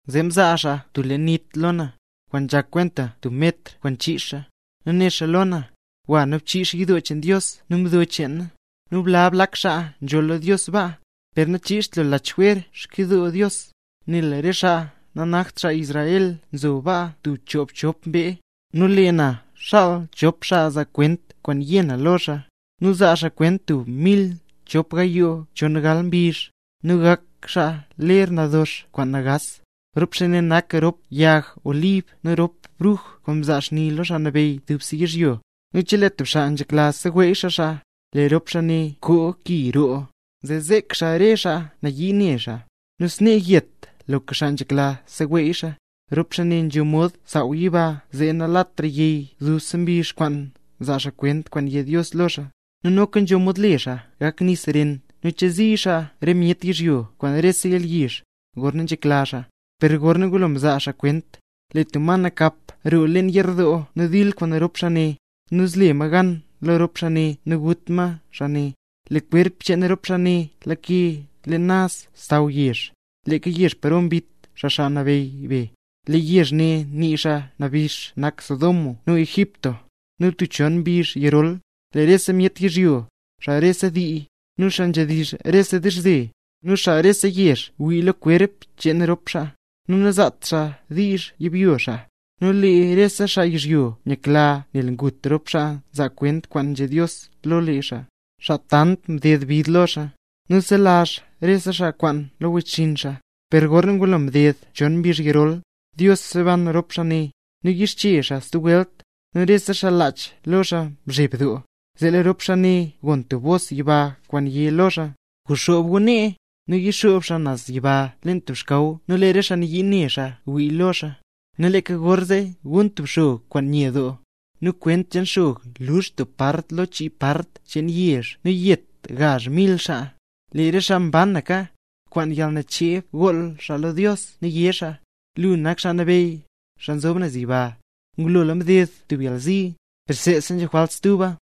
Zee mzaa xaa tub lee nit lo na, kwaan nzhak kwenta tub metr kwaan nchiix xaa, nu né xaa lo na: —Gwa nu bchiix yidoo cheen Dios nu mdo cheena, nu blab lak xaa nzholl lo Dios baa. Per nachiixt lu lach jwer Xkyidoo Dios, nel re xaa nanakt xaa Israel zo baa tub choobchop mbee. Nu lee na xaal chop xaa zaa kwent kwaan yé na lo xaa, nu zaa xaa kwent tub mil chop gayoo chon gal mbizh, nu gak xaa ler nadox kwaan nagaas. Rop xaa ne nak rop yag olib nu rop bruj kwaan nzaa xni lo Xaa Nabeyy dubse yizhyo. Nu chelee tub xaa nzhekla seweey xaa xaa, lee rop xaa ne koo ki roo, zee zek xaa re xaa nayii ne xaa; nu snee yet loka xaa nzhekla seweey xaa. Rop xaa ne nzho mod saaw yiba zee nalatra yey dubse mbizh kwaan zaa xaa kwent kwaan yé Dios lo xaa; nu noka nzho mod le xaa gak nis ren nu chezi xaa re myet yizhyo kwaan rese yalzi, gorna nzhekla xaa. Per gorna ngulo mzaa xaa kwent, lee tub ma nakap roo leen yerdoo nu dil kwaan rop xaa ne, nu zle ma gan lo rop xaa ne nu gut ma xaa ne. Lee kwerp cheen rop xaa ne lake leen naz xsaww yezh, leeka yezh paro mbit xaa Xaa Nabeyy be. Lee yezh ne nii xaa nabix nak Sodoma nu Egipto. Nu tub chon mbizh yirol, lee rese myet yizhyo, xaa rese dii, nu xaa nzhedizh rese dizhze, nu xaa rese yezh wii lo kwerp cheen rop xaa, nu nazaat re xaa diizh yibyo xaa. Nu lee rese xaa yizhyo nyakla nel ngut rop xaa mzaa kwent kwaan nzhé Dios lo lee xaa, xaa tant mted bid lo xaa. Nu zelazh rese xaa kwaan lo wechxinn xaa. Per gorna ngulo mded chon mbizh yirol, Dios seban rop xaa ne, nu yixche xaa stub welt, nu rese xaa lach lo xaa zheb doo xaa. Zee lee rop xaa ne gon tub bos yiba kwaan yé lo xaa: —¡Guxoob gu nee! Nu yixoob xaa naz yiba leen tub xkaw nu lee re xaa nayii ne xaa wii lo xaa. Nu leeka gorzee gun tub xog kwaan nye doo, nu kwent cheen xog lux tub part lo chii part cheen yezh nu yet gazh mil xaa. Lee re xaa mbanaka, kwaan yalnacheb gool xaa lo Dios nu yé xaa: —Lu nak Xaa Nabeyy, xaa nzob naz yiba. Ngulola mded tub yalzi, per seesa nzho jwalt stuba.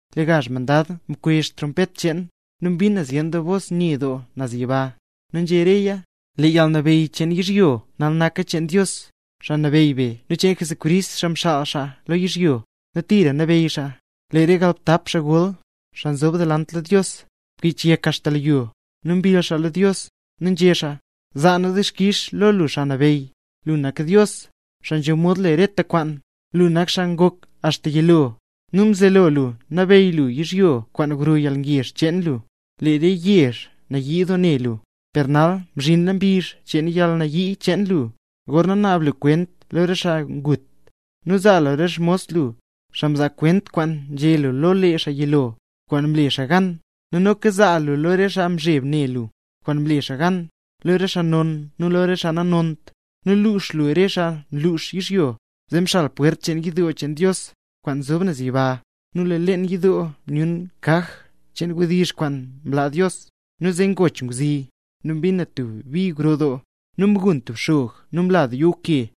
Lee gazh mandad mkwezh trompet cheen, nu mbin na zyen bos nye doo naz yiba, nu nzhé reya: Lee yalnabeyy cheen yizhyo nal naka cheen Dios, Xaa Nabeyy be nu cheen Jesucrist Xaa Mxaal xaa lo yizhyo, nu tira nabeyy xaa. Lee re galbtap xaa gol, xaa nzob delant lo Dios, mkich yek axta lo yo, nu mbill xaa lo Dios, nu nzhé xaa: Nzaa nu dixkix lo lu Xaa Nabeyy, lu nak Dios, xaa nzho mod le rese kwaan, lu nak xaa ngok axta yilo, nu mzelo lu nabeyy lu yizhyo kwaan gro yalngezh cheen lu. Lee re yezh nayii doo ne lu; per nal mzhinla mbizh cheen yalnayii cheen lu, gorna naab lu kwent lo re xaa ngut. Nu zaa lu lo re xmos lu, xaa mzaa kwent kwaan nzhé lu lo lee xaa yilo, kwaan mle xaa gan, nu noka zaa lu lo re xaa nzheb ne lu, xaa nambey nak, kwaan mle xaa gan, lo re xaa non nu lo re xaa nanont. Nu lux lu re xaa nlux yizhyo. Zee mxal pwert cheen yidoo cheen Dios, kwaan nzob naz yiba, nu lee leen yidoo myun kaj cheen wdizh kwaan mlaa Dios. Nu zee ngoch ngwzi, nu mbin na tub bi gro doo, nu mgun tub xog nu mla doo yuuke.